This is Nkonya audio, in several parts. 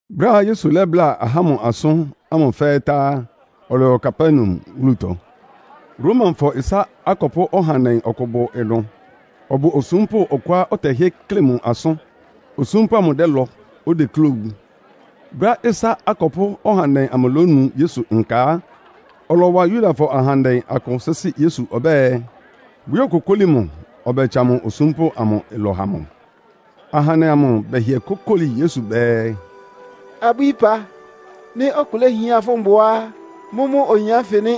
Brɛ́á Yesu lɛ́bláa ahá ámʋ asʋ́n ánfɩ fɛ́ɛ́ tá á, ɔlɔyɔ Kapernaum wúlutɔ. Romafɔ ɩsá akɔpʋ́ ɔhandɛ ɔkʋ bʋ ɩnʋ. Ɔbʋ osúmpʋ́ ɔkʋá ɔtɛhɩ́ɛ́ kle mʋ asʋ́n. Osúmpʋ́ amʋ dɛ́lɔ, odeklé owu. Brɛ́á ɩsá akɔpʋ́ ɔhandɛ amʋ lónu Yesu nka á, ɔlɔwa Yudafɔ ahandɛ akʋ sɩ́sɩ́ Yesu ɔbɛ́ɛ, bʋyókokóli mʋ ɔbɛtsa mʋ osúmpʋ́ amʋ ɩlɔ ha mʋ. Ahandɛ amʋ bɛhɩɛ kókóli Yesu bɛɛ, “Abwíí ɩpa, nɩ́ ɔkʋ léhián fʋ́ mbʋa á, mʋ́mʋ́ oyin ánfɩ nɩ́!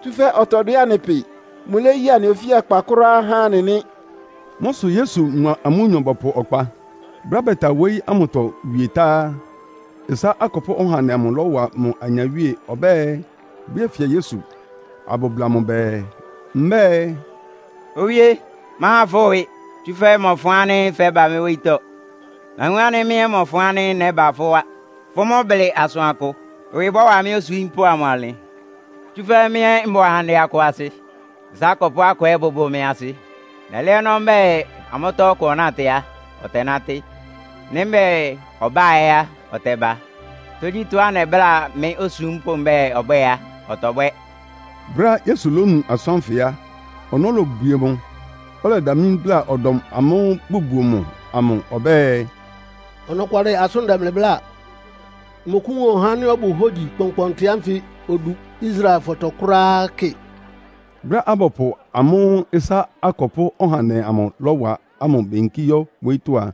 Tsúfɛ́ ɔtɔdwɛ́ anɩ pɩ. Mʋléyi anɩ ofíakpa kʋ́ráá há anɩ nɩ́.” Mʋ́ sʋ Yesu mʋa amʋ́nyɔ bɔpʋ ɔkpa. Brɛ́á bɛta wóyí ámʋtɔ wie tá á, ɩsá akɔpʋ́ ɔhandɛ amʋ lɔ́wa mʋ anyawíe ɔbɛ́ɛ bʋyéfia Yesu, abʋbla mʋ bɛɛ, mbɛ́ɛ, “Owíé! Máhan fʋ́ ɩwɩ, tsúfɛ́ mmɔfʋn ánɩ́ fɛ́ba mɩ́ wóyítɔ́. Nawun ánɩ́ mɩ́ ɛ́ mmɔfʋn ánɩ́ nɛ́ba fʋ́ wá. Fʋ́ mʋ́ blɩ asʋankʋ, ɩwɩ bɔ́wa mɩ́ osúmpʋ́ amʋ ɔnlɩn. Tsúfɛ́ mɩ́ ɛ́ mbʋ ahandɛ akʋ asɩ. Ɩsá akɔpʋ́ akʋ ɛ́ bʋbʋ mɩ́ asɩ. Nɛlɛ́ ɔnɔ́ mbɛ́ɛ amʋ́tɔ́ ɔkʋ ɔnátɩ á, ɔtɛnátɩ́. Nɩ́ mbɛ́ɛ ɔbá ɛ́ á, ɔtɛba. Tógyítɔ́á nɛbláa mɩ́ osúmpʋ́ mbɛ́ɛ ɔbwɛ́ɛ á, ɔtɔbwɛ́.” Brɛ́á Yesu lónu asʋ́n ánfɩ á, ɔnɔ́ lobwie mʋ, ɔlɛdamlí bláa ɔdɔm amʋ́ʋ́ bʋbuo mʋ amʋ ɔbɛ́ɛ, “Ɔnɔkwalɩ asʋ́n, ndɛ mlɩ bláa, mmɔkʋ́wun ɔhá ánɩ́ ɔbʋ hógyi kpɔnkpɔntɩ ánfɩ odu Israelfɔtɔ kʋ́ráá kɩ!” Brɛ́á abɔpʋ amʋ́ʋ́ ɩsá akɔpʋ́ ɔhandɛ amʋ lɔ́wa ámʋ beyinkí yɔ́ wóyítɔ́ a,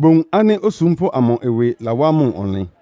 bowun ánɩ́ osúmpʋ́ amʋ ɩwɩ lawá mʋ ɔnlɩn.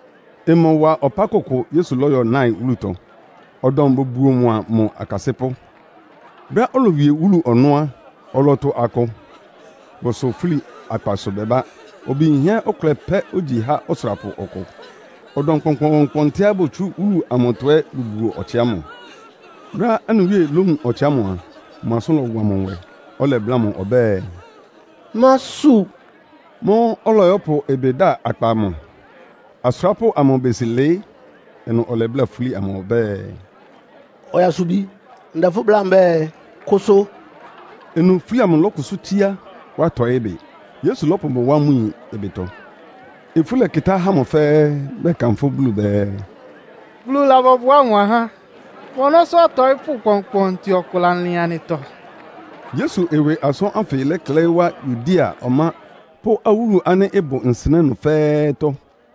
Ɩmɔwa ɔpá kʋkʋ Yesu lɔ́yɔ Nain wúlutɔ. Ɔdɔm bʋbuo mʋa mʋ akasɩ́pʋ́. Brɛ́á olowie wúlu ɔnɔ́ á, ɔlɔtʋ akʋ, bʋsʋn fúli akpasʋ bɛbá. Obi yinhɛ́ ɔkʋlɛ pɛ́ ogyi há ɔsʋrapʋ ɔkʋ. Ɔdɔm kpɔnkpɔɔnkpɔntɩá botsú wúlu amʋtɔ ɛ́ bʋbuo ɔtsɩ ámʋ. Brɛ́á anɩ Wíe lówun ɔtsɩ ámʋ a, mʋ asʋ́n lɔwa mʋ nwɛ, ɔlɛbláa mʋ ɔbɛ́ɛ, “Másu!” Mʋ́ʋ́ ɔlɔyɔ́pʋ ɩbɩ da akpa amʋ, asʋrápʋ́ amʋ besi lɩɩ́. Ɩnʋ ɔlɛbláa fúli amʋ ɔbɛ́ɛ, “Ɔyasubi, ndɛ fʋ́ bláa mbɛ́ɛ, kʋsʋ!” Ɩnʋ fúli amʋ lɔ́kʋsʋ́ tsíá, wá tɔɩ́ bɩ. Yesu lɔ́pʋ mʋ wá mʋ yin ɩbɩtɔ. Ifú lɛkɩtá ahá ámʋ fɛ́ɛ́, bɛkanfʋ́ Bulu bɛɛ, “Bulu labɔbʋá mʋ ahá! Mʋ ɔnɔ́sʋ́ ɔtɔɩ́pʋ́ kpɔnkpɔntɩ ɔkʋ lalɩn anɩtɔ!” Yesu ɩwɩ asʋ́n ánfɩ lɛklɛɩ́ wá Yudea ɔmá pʋ́ awúlu ánɩ́ ɩbʋ nsɩnɛ́ ɩnʋ fɛ́ɛ́tɔ́.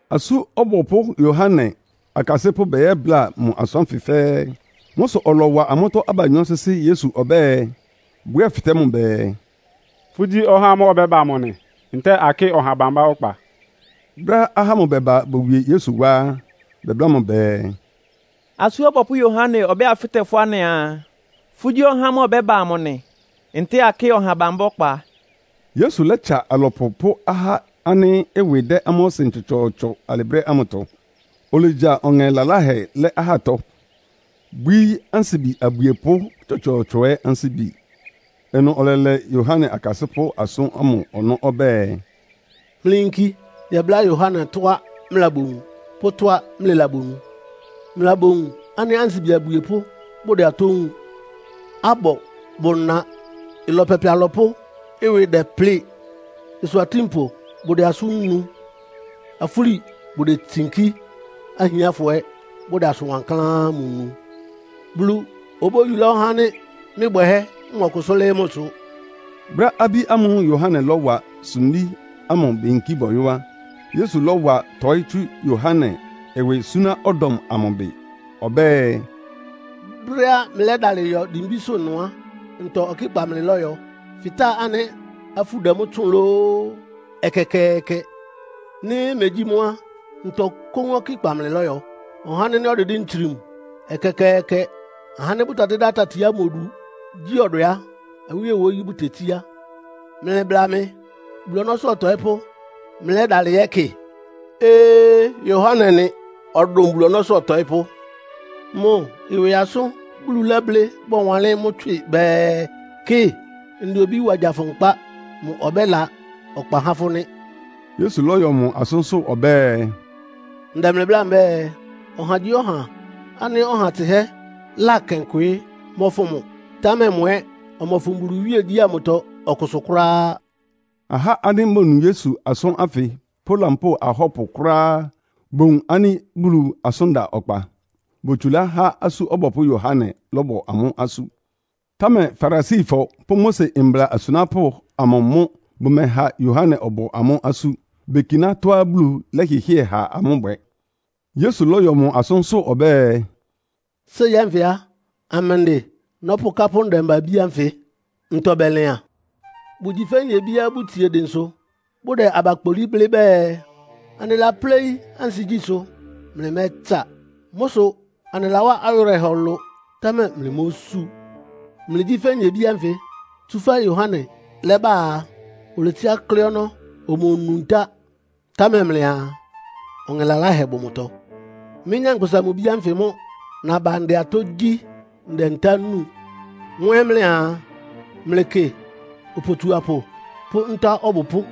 Asú Ɔbɔpʋ́ Yohane akasɩ́pʋ́ bɛyɛ́bláa mʋ asʋ́n ánfɩ fɛ́ɛ́. Mʋ́ sʋ ɔlɔwa amʋ́tɔ́ abanyɔ́ sɩ́sɩ́ Yesu ɔbɛ́ɛ, bʋyɛ́fɩtɛ́ mʋ bɛɛ, “Fʋ́gyí ɔhá ámʋ́ʋ́ ɔbɛ́ba amʋ nɩ, ntɛ́ɛ akɩ́ɩ ɔha bambá ɔkpa?” Brɛ́á ahá ámʋ bɛba bowie Yesu wá á, bɛbláa mʋ bɛɛ, “Asú Ɔbɔpʋ́ Yohane ɔbɛ́ɛ abɛ́fɩtɛ́ fʋ́ anɩaa, ‘Fʋ́gyí ɔhá ámʋ́ʋ́ ɔbɛ́ba amʋ nɩ, ntɛ́ɛ akɩ́ɩ ɔha bambá ɔkpa?’” Yesu lɛ́tsa alɔpʋ pʋ́ ahá ánɩ́ ɩwɩ dɛ́ amʋ́ ɔsɩn tsɔtsɔɔtsɔ alɩ brɛ́ ámʋtɔ. Olegya ɔŋɛ laláhɛ lɛ́ ahátɔ, bwíí ansibi abwiepʋ́ tsɔtsɔɔtsɔ ɛ́ ansíbi. Ɩnʋ ɔlɛlɛ Yohane akasɩ́pʋ́ asʋ́n ámʋ ɔnɔ́ ɔbɛ́ɛ, “Mlɩyinki yɛbláa Yohane tɔ́á mlɩlabowun pʋ́ mʋ́a mlɩlabonu. Mlɩlabowun ánɩ́ ansibi abwiepʋ́ bʋdɛ atɔ́ wúun, abɔ bʋna. Ɩlɔ pɛpɛ alɔpʋ́ ɩwɩ dɛplɩ́ɩ, ɩsʋ atínpʋ bʋdɛ asʋ́n nu. Afúli bʋdetsinkí, ahiánfɔ ɛ́ bʋdɛ asʋn wankláán ámʋ nu. Bulu obóyulá ɔhá ánɩ́ mɩ́ bwɛhɛ́ mɔkʋsʋ́ lɩ́ɩ́ mʋsʋ.” Brɛ́á abí ámʋ́ʋ́ Yohane lɔ́wa sumbí ámʋ beyinkí bɔyɔ́ á, Yesu lɔ́wa tɔɩ́ tsú Yohane ɩwɩ súná ɔdɔm amʋ bɩ. Ɔbɛ́ɛ, “Brɛ́á mlɩlɛ́dalɩ yɔ dimbísʋ́ ɩnʋ á, ntɔ ɔkɩ́kpa mlɩlɔ́yɔ? Fɩtáa ánɩ́ afú dɛ mʋ́ tsʋ́ʋn lóó? Ɛkɛkɛɛkɛ! Nɩ́ megyí mʋ́ á, ntɔ kóún ɔkɩ́kpa mlɩlɔ́yɔ? Ɔhá ánɩ́ ɔdɩdɩ́ ntsrim. Ɛkɛkɛɛkɛ! Ahá ánɩ́ bʋtɛdɩ́dá tati ámʋ odu gyi ɔdwɛ á, awíe wóyí bʋtetsíá. Mlɩbla mɩ! Bulu ɔnɔ́sʋ́ ɔtɔɩ́pʋ́ mlɩlɛ́dalɩ yɛ́kɩ? Ee, Yohane nɩ. Ɔdʋn Bulu ɔnɔ́sʋ́ ɔtɔɩ́pʋ́. Mʋ ɩwɩ asʋ́n Bulu lɛ́blɩ́ bɔwanlɩ́n mʋ́ tswɩ bɛɛ, ‘Kɩ, ndɛ obí wa gya fʋ nkpá. Mʋ ɔbɛ́la ɔkpa há fʋ́ nɩ́.’” Yesu lɔ́yɔ mʋ asʋ́nsʋ́ ɔbɛ́ɛ, “Ndɛ mlɩ bláa mbɛ́ɛ, ɔhagyíɔha ánɩ́ ɔha tsɩhɛ́ lakɛn kwɩɩ́ mɔ́fʋn mʋ, támɛ mʋ ɛ́ ɔmɔfʋn Bulu iwíegyí ámʋtɔ ɔkʋsʋ kʋ́ráá.” Aha ánɩ́ bonu Yesu asʋ́n ánfɩ pʋ́ lampóo ahɔ́pʋ kʋ́ráá bowun ánɩ́ Bulu asʋ́n da ɔkpa. Botsulá há Asú Ɔbɔpʋ́ Yohane lɔ́bɔ amʋ́ asú. Támɛ Farisifɔ pʋ́ Mose mbla asunápʋ́ amʋ mʋ́ bʋmɛha Yohane ɔbɔ amʋ́ asú. Bekiná tɔ́á Bulu lɛ́hɩhɩ́ɛ ha amʋ́ bwɛ. Yesu lɔ́yɔ mʋ asʋ́nsʋ́ ɔbɛ́ɛ, “Séi ánfɩ á, amɛndɩ nɔ́pʋkápʋ́ ndɛmba-abí ánfɩ? Ntɔ bɛlɩan? Bʋgyi fɛ́ nyebíá bʋtsie dɩnsʋ bʋdɛ aba kpolí, blɩ́ bɛɛ, ‘Anɩlapléí ansigyísʋ́, mlɩmɛ́tsa. Mʋ́ sʋ anɩlawá awɩrɛhɔ ɩlʋ, támɛ mlɩmósú.’ Mlɩgyí fɛ́ nyebí ánfɩ, tsúfɛ́ Yohane lɛ́ba á, oletsiá klɩ́ ɔnɔ́, omonu ntá, támɛ mlɩaa, ‘Ɔŋɛ laláhɛ bʋ mʋtɔ!’ Mɩ́, Nyankpʋsa-Mʋ-Bi ánfɩ mʋ́ naba ndɛ atɔ́ gyí, ndɛ ntá núu. Mʋ́ ɛ́ mlɩaa, ‘Mlɩkɩ opotsuapʋ pʋ́ nta ɔbʋpʋ́.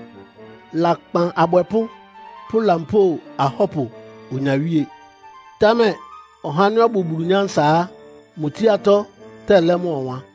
Lakpan abwɛpʋ́ pʋ́ lampóo ahɔ́pʋ onyawíe.’ Támɛ ɔhá ánɩ́ ɔbʋ Bulu nyánsa á, mʋ tsíátɔ́ tɛlɛ́ mʋ́ ɔwan.”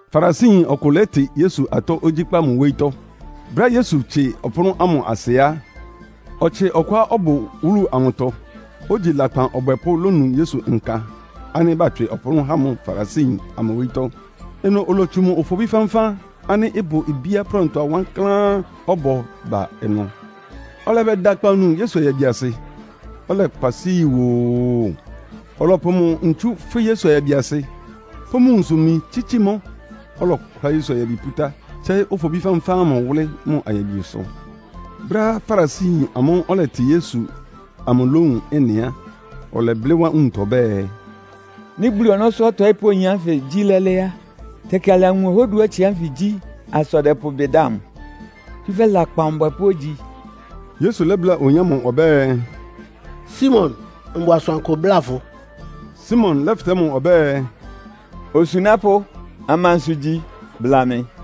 Farisiyin ɔkʋ lɛ́tɩ Yesu atɔ́ ogyíkpá mʋ wóyítɔ́. Brɛ́á Yesu tsie ɔpʋ́nʋ́ ámʋ asɩ á, ɔtsɩ ɔkʋá ɔbʋ wúlu amʋtɔ, ogyi lakpan ɔbwɛpʋ́ lónu Yesu nka ánɩ́ batswɩ ɔpʋ́nʋ́ há mʋ Farisiyin amʋ wóyítɔ́. Ɩnʋ olotsu mʋ ofobí fánfán ánɩ́ ɩbʋ bíá prɛntʋa wankláán ɔbɔ ba ɩnʋ. Ɔlɛbɛda akpawunu Yesu ayabiasɩ, ɔlɛkpa isú yi woo. Ɔlɔpʋ mʋ ntsú fwɩ́ Yesu ayabiasɩ, pʋ́ mʋ nwunsʋ-imi tsítsi mʋ́. Ɔlɔkʋlá Yesu ayabi pútá, tsɛ́ɩ́ ofobí fánfán ámʋ wʋ́lɩ́ mʋ ayabisʋ. Brɛ́á Farisiyin amʋ́ʋ́ ɔlɛtɩ Yesu amʋ lówun ɩ́nɩ á, ɔlɛblɩ́ wá nwuntɔ ɔbɛ́ɛ, “Nɩ́ Bulu ɔnɔ́sʋ́ ɔtɔɩ́pʋ́ oyin ánfɩ gyí lɛ́lɛ́ á, tɛkɩ alawun ɔhá oduá ɔtsɩ ánfɩ gyí asa ɔdɛpʋ ɩbɩ da mʋ, tsúfɛ́ lakpan ɔbwɛpʋ́ ogyi.” Yesu lɛ́bláa oyin ámʋ ɔbɛ́ɛ, “Simon, mbʋ asʋankʋ bláa fʋ.” Simon lɛ́fɩtɛ́ mʋ ɔbɛ́ɛ, “Osunápʋ́, amansʋ igyi? Bla mɩ.”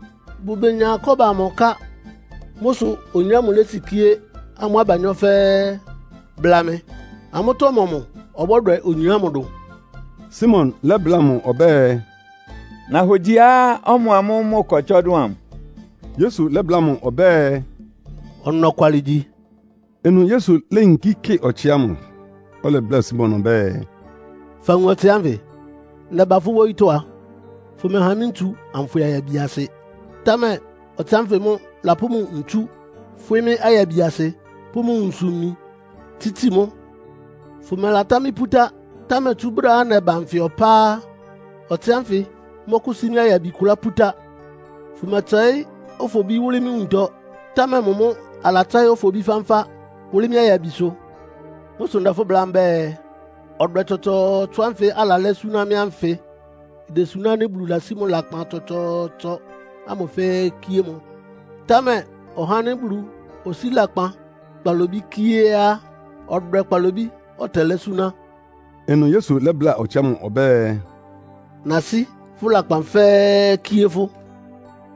Bʋmenyá kɔ́ba amʋ ká. Mʋ́ sʋ oyin ámʋ lésikíé amʋ́ abanyɔ́ fɛ́ɛ́. Bla mɩ, amʋ́tɔ́ ɔmɔmʋ ɔbɔ́dwɛ oyin ámʋ dʋn?” Simon lɛ́bláa mʋ ɔbɛ́ɛ, “Nahogyiá ɔmʋamʋ́ʋ́ mʋ ɩkɔ tsɔ dʋn amʋ.” Yesu lɛ́bláa mʋ ɔbɛ́ɛ, “Ɔnɔkwalɩ igyi.” Ɩnʋ Yesu léyinkí kɩ ɔtsɩ ámʋ, ɔlɛbláa Simon ɔbɛ́ɛ, “Fawun ɔtsɩ ánfɩ? Nɛba fʋ́ wóyítɔ́ a, fʋmɛha mɩ́ ntsu anfwɩ ayabiasɩ. Támɛ ɔtsɩ ánfɩ mʋ́ lapʋ́ mʋ ntsú fwɩ́ mɩ́ ayabiasɩ, pʋ́ mʋ nwunsʋ-imi tsítsi mʋ́. Fʋmɛlatá mɩ́ pútá, támɛ tsú brɛ́á nɛba nfɩ ɔpá á, ɔtsɩ ánfɩ mɔ́kʋ́sí mɩ́ ayabi kʋlá pútá. Fʋmɛtsɛɩ́ ofobí wʋ́lɩ́ mɩ́ nwuntɔ, támɛ mʋ mʋ́ alatsɛ́ɩ́ ofobí fánfán wʋ́lɩ́ mɩ́ ayabisʋ. Mʋ́ sʋ ndɛ fʋ́ bláa mbɛ́ɛ, ɔdwɛ tsɔtsɔɔtsɔ ánfɩ alalɛ́ súná mɩ́ ánfɩ idesuná ánɩ́ Bulu lasí mʋ lakpan tsɔtsɔɔtsɔ ámʋ fɛ́ɛ́ kíé mʋ. Támɛ ɔhá ánɩ́ Bulu osíi lakpan kpalobí kíé á, ɔdwɛ kpalobí ɔtɛlɛ́ súná.” Ɩnʋ Yesu lɛ́bláa ɔtsɩ ámʋ ɔbɛ́ɛ, “Nasí fʋ́ lakpan fɛ́ɛ́ kíé fʋ́.”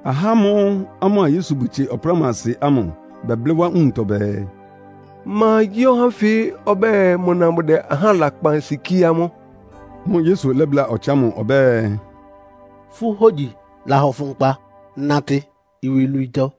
Ahá ámʋ́ʋ́ amʋ́a Yesu bʋtsie ɔpʋ́nʋ́asɩ ámʋ, bɛblɩ́ wá nwuntɔ bɛɛ, “Ma gyí oyin ánfɩ ɔbɛ́ɛ mʋna mʋdɛ ahá lakpan sikíé amʋ́.” Mʋ́ʋ́ Yesu lɛ́bláa ɔtsɩ ámʋ ɔbɛ́ɛ, “Fʋ́ hógyi lahɔ fʋ nkpa. Natɩ iwilwiitɔ.”